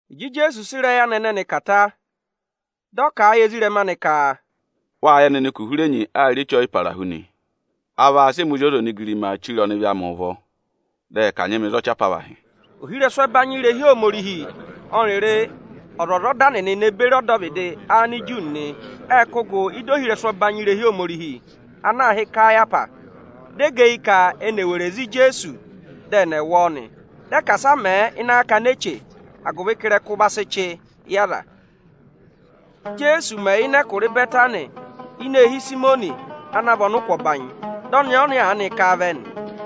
Ịjị Ijeesu sị ịrẹyị anị ẹnẹnị kà ta, dị ọ kà a yị ezirẹma anị ka: “Wâ yẹ nịnị ka uhurenyi aa rị Eche ọyịparahu nị. A vaa sị ẹmị Ozi ọza onigirimaa chire ọnịvị amị ụvọ, dị ẹ kanyị mị za ọchị apavahị.” Ohirẹsụ ẹbanyị irehi Ohomorihi ọnịrị ọzwọzọda nịnị ne beri ọdọvịdị Aniju nịnị ệ kụ́ gụ ị́da ohirẹsụ ọbanyị irehi Ohomorihi ana aā hị́ Ikayahwasi. Dị ẹ gẹ eyi ka ẹnị èe weree za Ijeesu, dị ẹnị ẹ̀ wụ ọọ nị. Dị ẹ ka asị a mẹ̀ ẹ ịnị akakana eche, agụvị ka ịrẹkụ va sị chị yị aza nị. Íjeesu mẹ̀ yà ịnị ẹkụra Ịbẹtanị ini eehi Ịsayịmọnị ana vị ọnịkụ ọbanyị, di ọnẹẹ ọnya aanị ká a vẹ nị.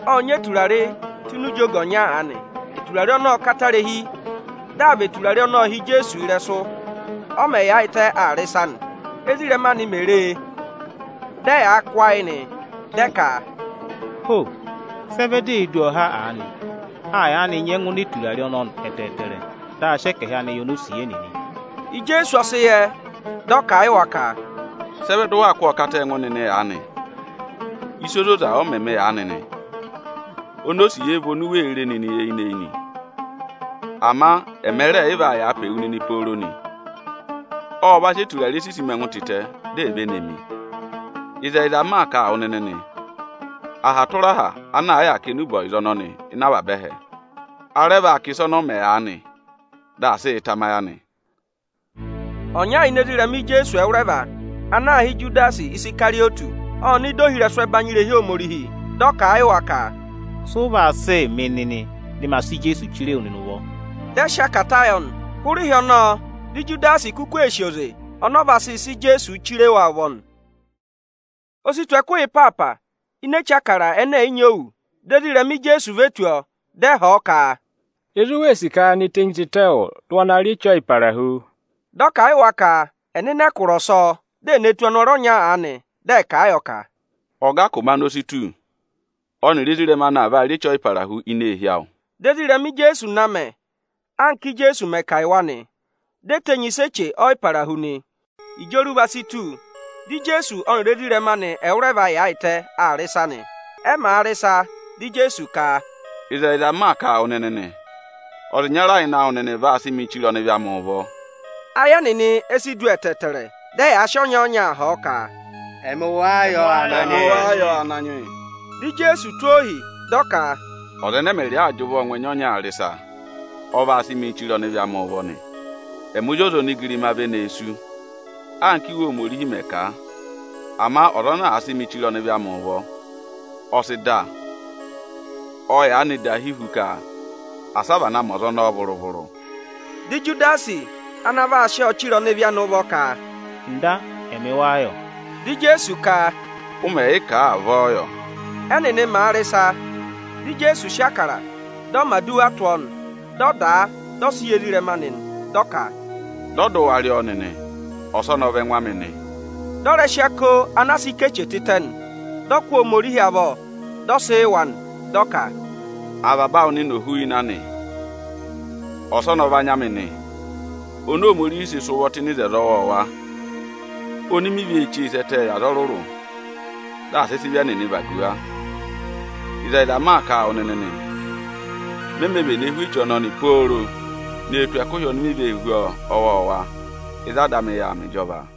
Ộ nyị eturare tụ́ ini ijonggo ọnya aanị. Eturare ọnọọ ộ katarihi. Dị aa và eturare ọnọọ hi Ijeesu ịrẹsụ, ọ mẹ̀ yaayịtẹ aa rị ịsa nị. Ézirẹma anị mè re e, dị ẹyaa kụ́ ayị nị. Dị ẹ ka, “Ho! Sị ẹ vẹ di ee du ọọ ha aanị? A yaanị nyẹngụ ná eturare ọnọọ ẹtẹẹtẹrẹ, dị a sị ẹkẹhị anị yị onosiye nịnị.” Ijeesu ọ sị yẹ, dị ọ kà a yị wa ka, “Sị ẹ vẹ dị ụ waa kụ́ ọọ kata a ẹngụ nịnị aanị? Ịsa ozoza ọ mẹ mị aanị nị. Onosiye vị oni u wee re nịnị eyinị-eyinị; ama ẹma rẹẹ̀ yị vaa yàa pe wu nịnị pooro nị. Ộ va sị eturare sisi mi ẹngụ tịtẹ, di è ve ne mi. Ịzẹyịza m maa kà a wụ nịnị nị, aha tụra aha ana àa yà aa kà enube ọyịza ọnọnị ịnị avaba ẹhẹ, a rẹ vaa kà ịsa ọnọọ mẹ aanị, dị aa sịị tamayị anị.” Ọnya ini ezirẹma Ijeesu ẹwụrẹva ana aā hị́ Ijudasi Isikarịyọtị ộ nọ ịdị ohirẹsụ ẹbanyị irehi Ohomorihi. Dị ọ kà a yị wa ka, “Sị ụ vaa sịị mị nịnị, dị ma sị Ijeesu chire wu nịnị ụvọ?” Dị ẹ sị akata yọ nị. Hụrẹ ịhị ọnọọ dị Ijudasi kuku ee sì oze ọnọọ vaa sịị sị Ijeesuu chire wa ụvọ nị. O si tù ẹkụhị ịpaapa ini Eche Ịbụrẹẹdị ẹnẹ ẹ̀ yị nyị òwù. Dị ezirẹma Ijeesu ve tù ọọ, dị ẹ họ̀ ọ ka, “Ịzị u wee sì ka ye ne tenyi tịtẹ yị wụ, dị ụ wa na yà rị Eche Ọyịparahu?” Dị ọ kà a yị wa ka ẹ̀ nọ ịnị ẹkụra ọsọọ, dị è ne tù ọnọrụ ọnya aanị, dị ẹ̀ kà a yọ ka, “Ọga ka ụmẹ anị o si tù, ọnịrị ezirẹma anị vaa rị Eche Ọyịparahu ini eehi awụ.” Dị ezirẹma Ijeesu na mẹ, anka Íjeesu mẹ̀ kà a yị wa nị. Di e tenyi ịsa Eche Ọyịparahu nị. Ịjị oruva si tù, dị Ijeesu ọnịrị ezirẹma anị ẹwụrẹva yaayịtẹ aa rị ịsa nị. Ẹ màa rị ịsa, dị Ijeesu ka, “Ịzẹyịza m maa kà a wụ nịnị nị, ọza ịnyara ịnị awụ nịnị vaa sị mịị chire ọnịvị amị ụvọ.” Ayị ẹnịnị e si du ẹtẹẹtẹrẹ, dị ẹyaa sị ọnya-ọnya họ̀ ọ ka, “Ẹmị wáá yọ, Ananyị yị?” Dị Ijeesu tụ́ ohi, dị ọ ka, “Ọza ẹnẹ ẹmịrịị aa jị ụvọọ ngụ ẹnya ọnyaa rị ịsa, ọ vaa sị mịị chire ọnịvị amị ụvọ nị. Ẹmị Ozi ọza onigirima ve nee sú, anka Íwe Ohomorihi mẹ̀ kà a. Ama ọza ana àa sị mị chire ọnịvị amị ụvọ, ọ sị dà. Ọ yaanị dahi hu ka asị a vana ma ọza ọnọọ vụrụ-vụrụ.” Dị Ijudasi ana vaa sị ọọ chire ọnịvị anị ụvọ ka, “Ọga, ẹmị wáá yọ?” Dị Ijeesu ka, “Ụ mẹ̀ yị kà a, avọọ yọ.” Ẹ́nịnị màa rị ịsa, dị Ijeesu sị Ịbụrẹẹdị, dị ọ mẹ̀ aduwa tụ́ ọọ nị. Dị ọ dà a, dị ọ sị yị ezirẹma anị nị. Dị ọ ka, “Dọ dị ụ wa rị ọọ nịnị, ọsọnị ọ vị ẹngụ amị nị.” Dị ọ rẹ sị ako anaa sị ká eche tịtẹ nị; dị ọ kụ́ Ohomorihi avọ, dị ọ sị yị wa nị, dị ọ ka, “Avaba awụ nịnị ò hú ịnị anị! Ọsọnị ọ vị anya amị oni Ohomorihi sị sị ụvọ tụ́ ịnị oto ọwọọwa, oni mi vee chee sẹ́ ẹtẹẹ yị aza ọrụrụ, dị à sị sị ịvị ẹnịnị vagu wa. Ịzẹyịza m maa kà a wụ nịnị nị, me mē vene hú eche ọnọnị pooro ne tù ẹkụhị oni mi vee hú ọọ ọwọọwa ịzị Ada amị yà aa mẹ ịjọva.”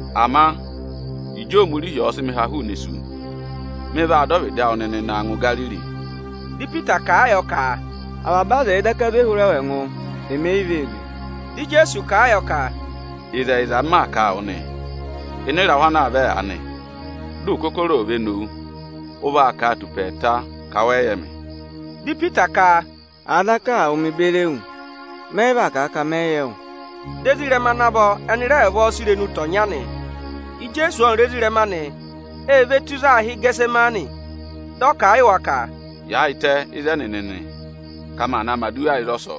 Ama Ịjị Ohomorihi ọ̀ọ sị mị ha hụụnị isu, mị vaa dọ ọvịdị awụ nịnị na ngụ Igariri.” Dị Ipita kà a yọ ka, “Avaba aza ẹ̀ẹ daka zwe hụrẹ wụ ẹngụ, emi e yi vee zwe.” Dị Ijeesu kà a yọ ka, “Ịzẹyịza m maa kà a wụ nị, ịnị ịrahụ ana aa vẹ aanị, dị ụkọkọrọ ò ve nowu, ụ vaa kà a tù ụpẹ ẹẹta ka wẹ yị yẹ mị.” Dị Ipita ka, “Àa daka aa wụ mịị beri ewu, mẹ yị vaa kà a ka mẹ yị yẹ wụ.” Dị ezirẹma ana vọ ẹnị rẹ vavọọ sị irenu tọ̀ ọnya nị. Ijeesu ọnịrị ezirẹma anị e ve tù ịzị aā hị́ Ịgẹtịsẹmanị. Dị ọ kà a yị wa ka, “Yaayịtẹ ịzẹnị nịnị, ka maa naa mẹ̀ aduwa ịzọsọọ!”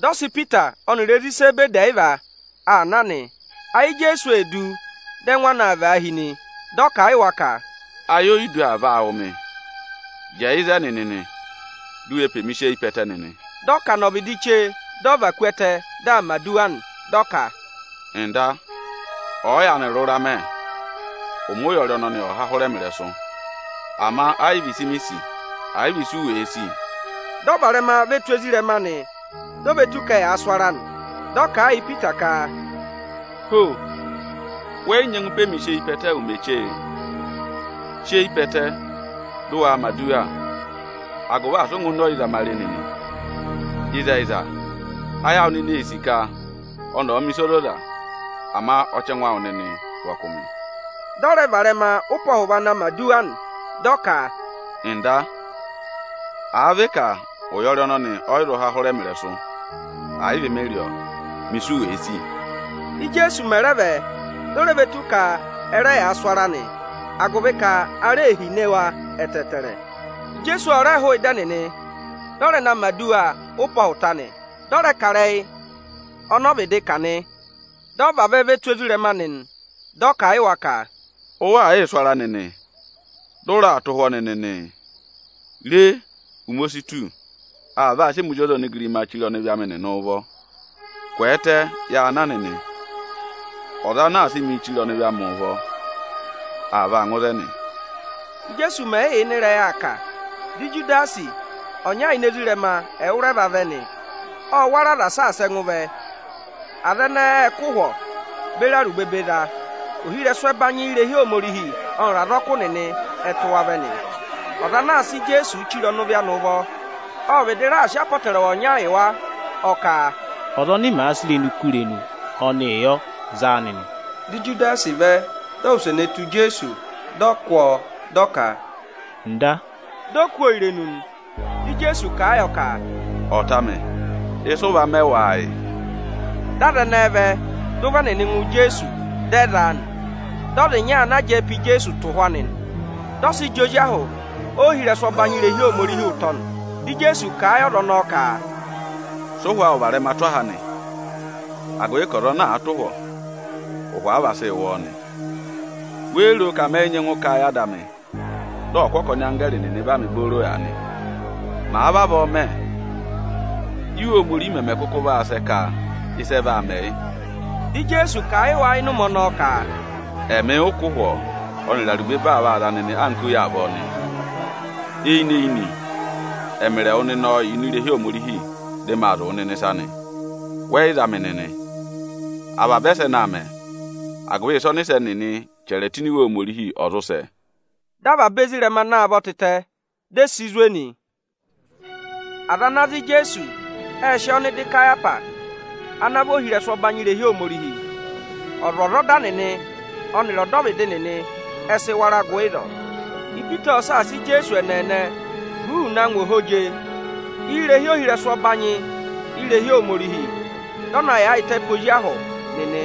Dị ọ sị Ipita ọnịrị ezi Izebedi ẹyịva aa na nị. Ayị Ijeesu ee du, dị ẹngụ anị aa vaahi nị. Dị ọ kà a yị wa ka, “Ayodu aa vaa wụ̀ mị. Jẹẹ ịzẹnị nịnị, di u we pe mi sị eyi pe ẹtẹ nịnị!” Dị ọ kà nọ ọvịdị chee, dị ọ va ku ẹtẹ, dị aa mẹ̀ aduwa nị. Dị ọ ka, “Ọga, ọ̀ọ yaanị rụra mẹ, ụmẹ ụyọrị ọnọnị ọ̀ há hụrẹ mị ịrẹsụ; ama ẹ yị vị ịsị mi sì, ẹ̀ yị vị ịsị u wèe sì.” Dị ọ varẹma ve tù ezirẹma anị, di o ve tù ka ẹyaa sụ ara nị. Dị ọ kà a yị Ipita ka, “Ho! Wẹ yị nyẹngụ pe mi sị eyi pe ẹtẹ ụmẹ chee? Sị eyi pe ẹtẹ, dị ụ waa mẹ̀ aduwa, agụvị asị ụ ngụ ịnị ọyịzamare nịnị! Ịzẹyịza ayị awụ nịnị ee sì ka ọnị ọ̀ mẹ̀ ịsa ozoza, ama ọchẹngụ awụ nịnị vị ọkụmị.” Dị ọ rẹ varẹma ụpẹ ọhụva na mẹ̀ aduwa nị, dị ọ ka, “Ọga, àa vị ka ụyọrị ọnọnị ọ yị zụ hụrẹ mị ịrẹsụ, ẹ̀ yị vị mị rị ọọ, mẹ ịsị u wèe sì!” Íjeesu mẹ̀ rẹ vẹ, di o re ve tù ka ẹ rẹ yaa sụ ara nị, agụvị ka ara ee hine wa ẹtẹẹtẹrẹ. Ijeesu ọ rẹ hụụ ịdị ẹnịnị, dị ọ rẹ na mẹ̀ aduwa ụpẹ ọhụta nị, dị ọ rẹ kà ịrẹyị ọnọọ vịdị kà nị. Dị ọ vavẹ ve tù ezirẹma anị nị, dị ọ kà a yị wa ka, “Ụ waa yịị sụ ara nịnị, dị ụ raa tụ́ ụhwọ́ nịnị nị? Re, ụmẹ o si tù, aa vaa sị ẹmị Ozi ọza onigirimaa chire ọnịvị amị nịnị ụvọ. Kwẹẹtẹ, ya na nịnị! Ọza ana a sị mịị chire ọnịvị amị ụvọ, aa vaa ngụ ịzẹnị.” Íjeesu mẹ̀ yị yà ịnị ịrẹyị aa kà, dị Ijudasi, ọnya ini ezirẹma ẹwụrẹva vẹ nị. Ộ wara aza saasa ẹngụ vẹ; aza ẹnẹẹ ệ kụ́ ụhwọ beri arubebe za. Ohirẹsụ ẹbanyị irehi Ohomorihi ọnịrị azọkụ nịnị ẹ tụ́ wa vẹ nị. Ọza ana aa sị Ijeesuu chire ọnịvị anị ụvọ, ộ vịdị raà sị apọtẹrẹwa ọnya yị wa, ọ ka, “Ọza ọnị mèe kú irenu, ọnịị yọ, za a nịnị!” Dị Ijudasi vẹ, di o wuse ne tù Ijeesu, dị ọ kụ́ ọọ, dị ọ ka, “Ọga”, di o kú ọọ irenu nị. Dị Ijeesu kà a yọ ka, “Ọta amị, ịsị ụ va mẹ wáá yị? Dị aza ẹnẹẹ vẹ, dị ụvọ ẹnịnị ngụ Ijeesu, dị ẹ za a nị.” Dị ọza ọnya ana jẹẹ pe Ijeesu tụ̀ ụhwọ anị, dị ọ sị jị ozi ahụ ohirẹsụ ọbanyị irehi Ohomorihi ụtọ nị. Dị Ijeesu kà a yị ọza ọnọọ ka, “Sị ụhwọ awụ varẹma tụ́ aha anị, agụvị ka ọza ana àa tụ̀ ụhwọ, ụhwọ a vaa sị wụ ọọ nị. Wéé ro ka mẹ yị nyẹngụ kà a yị Ada amị, dị ọ kụ́ ọkọnị anggẹẹrị nịnị va mị booro aanị? Màa vavọọ mẹ, Íwe Ohomorihi mẹmẹ kụkụ vaa sẹ ka ịsị ẹ vaa mẹ yị?” Dị Ijeesu kà a yị wa ịnị ụmẹ ọnọọ ka, “Ẹmị ụ kụ́ ụhwọ ọnịrị arubebe aa vaa za nịnị anka oyi avọọ nịị? Eyinị-eyinị ẹmịrị ẹwụ nịnị ộ yà ini irehi Ohomorihi, dị maa zụ̀ wụ nịnị ịsa nị, wẹ yị za mị nịnị. Avaba ẹsẹnị aa mẹ, agụvị ịsị ọnịsẹ nịnị chẹrẹ tụ́ ini Iwe Ohomorihi ọ̀ zụ sẹ.” Dị avaba ezirẹma na a vọ tịtẹ, di e si zwe nị. Aza ana za Ijeesu, ệ sị ọ nọ ịdị Ịkayapa ana vị ohirẹsụ ọbanyị irehi Ohomorihi. Ọzwọzọda nịnị ọnịrị ọdọvịdị nịnị ẹ sị wara gụ ịzọọ. Ipita ộ saasa Ijeesu ẹ́nẹẹnẹ huuu na ngụ ohweje irehi ohirẹsụ ọbanyị irehi Ohomorihi, dị ọ na yaayịtẹ pe ozi ahụ nịnị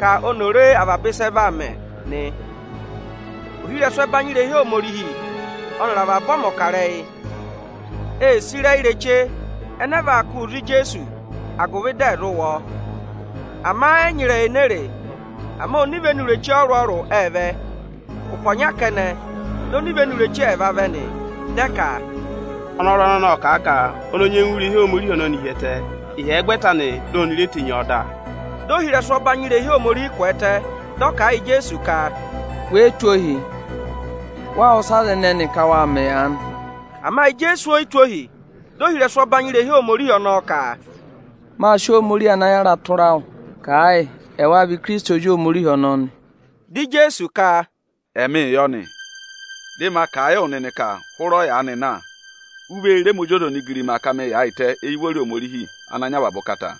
ka oni ò re avaba ịsị ẹ vaa mẹ nị. Ohirẹsụ ẹbanyị irehi Ohomorihi ọnịrị avaba ọmọkarẹyị ê sì ịrẹyị ireche ẹnẹẹ vaa kụ́ụ za Ijeesu, agụvị dị ẹ̀ zụ wụ ọ; ama ẹ yị nyị ịrẹyị enee re; ama onivenu ireche ọrụrụ-ọrụrụ ệ vẹ. Ụpẹ ọnya kẹnẹ, di onivenu ireche ẹẹva vẹ nị, dị ẹ ka, “Ọnọrụ ọnọnị ộ kà a ka ọnị o nyengu wú irehi Ohomorihi ọnọnị hi ẹtẹ, ịhyẹgwẹta anị, di oni re tenyi ọọ dà.” Dị ohirẹsụ ọbanyị irehi Ohomorihi kwẹẹtẹ, dị ọ kà a yị Ijeesu ka, “We yi tụ́ ohii? Wáá wụ́ ịsị aza ẹnẹnị ka waa mẹ aanị?” Ama Ijeesu o yi tụ́ ohi. Dị ohirẹsụ ọbanyị irehi Ohomorihi ọnọọ ka, “Mâ sị Ohomorihi ana yàra tụra wụ, kà a yị, ẹwáá vị Ikirisiti Ozi Ohomorihi ọnọọ nị?” Dị Ijeesu ka, “Ẹmịị yọ nị. Dị maa kà a yị wụ nịnị ka hụrẹ ọyaanị na, u vee re ẹmị Ozi ọza onigirima ka mâ yaayịtẹ éyi ụvọrị Ohomorihi Ochẹtẹngụ.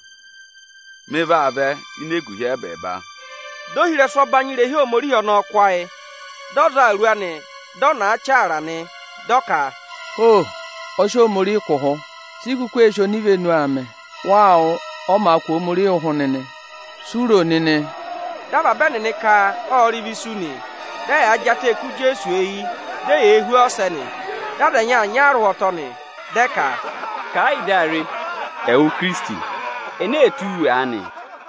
Mị vaa vẹ ini eguhi ẹ́bẹẹba.” Dị ohirẹsụ ọbanyị irehi Ohomorihi ọnọọ kụ́ ayị, dị ọ za awuru anị, dị ọ nàa chaara nị. Dị ọ ka, “Ho! Ọ sị Ohomorihi kụ̀ ụhụ! Si i kuku ee sì onivenu aa mẹ? Waa wụ́, ọ màa kụ̀ Ohomorihi ụhụ nịnị Si u ro nịnị?” Dị avaba ẹnịnị ka ộ rị ịvị isu nị. Dị ẹyaa jị atẹẹ kú Ijeesu eyi, di eyee hú ọ ọsẹ nị. Dị aza ẹnyị aa nya a arụhwọtọ nị, dị ẹ ka, “Kà ẹ yị dị a re, ẹwụ Ikirisiti, ene ee tụ́ wu aanị?”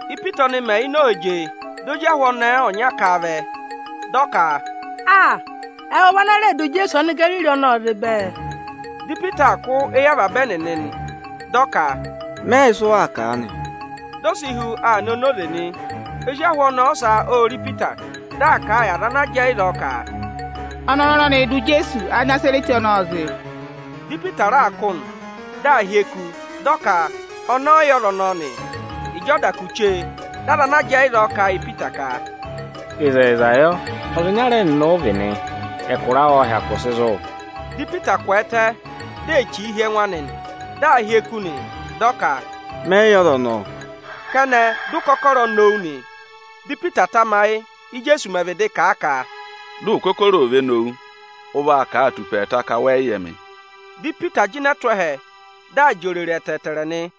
Ípita ọnị mẹ̀ yà ini ohweje, di ozi ahụ ọnẹẹ ọnya ká a vẹ, dị ọ ka, “Aa! Ẹwụ vị ana rẹẹ̄ dụ Ijeesu Anigariri ọnọọ zị bẹẹ!” Dị Ipita aa kụ́ éyi avaba ẹnịnị nị, dị ọ ka, “Mẹ yị yẹ ịsụ waa kà aanị.” Di o si hu aa nọ enoze nị. Ozi ahụ ọnẹẹ ọsa ô re Ipita, dị aa kà a yị aza ana jẹẹ ịzọọ ka, “Ọnọrụ ọnọnịị̄ dụ Ijeesu Anịnazarẹtị ọnọọ zị.” Dị Ipita raa kụ́ nị, dị aa hyeku, dị ọ ka ọnị ọ yị yẹ ọza ọnọọ nị. Ịjị ọ da kù chee, dị aza ana jẹẹ ịzọọ kà a yị Ipita ka, “Ịzẹyịza yọ, ọza ịnyara ẹnịnị ụ vị nị, ẹkụra awụ ộ hyakụ sị zụ̀.” Dị Ipita kwẹẹtẹ, di ee chìi hi ẹngụ anị, dị aa hyeku nị, dị ọ ka, “Mẹ yị yẹ ọza ọnọọ!” Kẹnẹ, dị ụkọkọrọ nowu nị. Dị Ipita tamayị, Ijeesu mẹ̀ vịdị kà a ka, “Dị ụkọkọrọ ò ve nowu, ụ vaa kà a tù ụpẹ ẹẹta ka wẹ yị yẹ mị.” Dị Ipita jịnẹ tụ́ ẹhẹ, dị aa jị òrèrè ẹtẹẹtẹrẹ nị.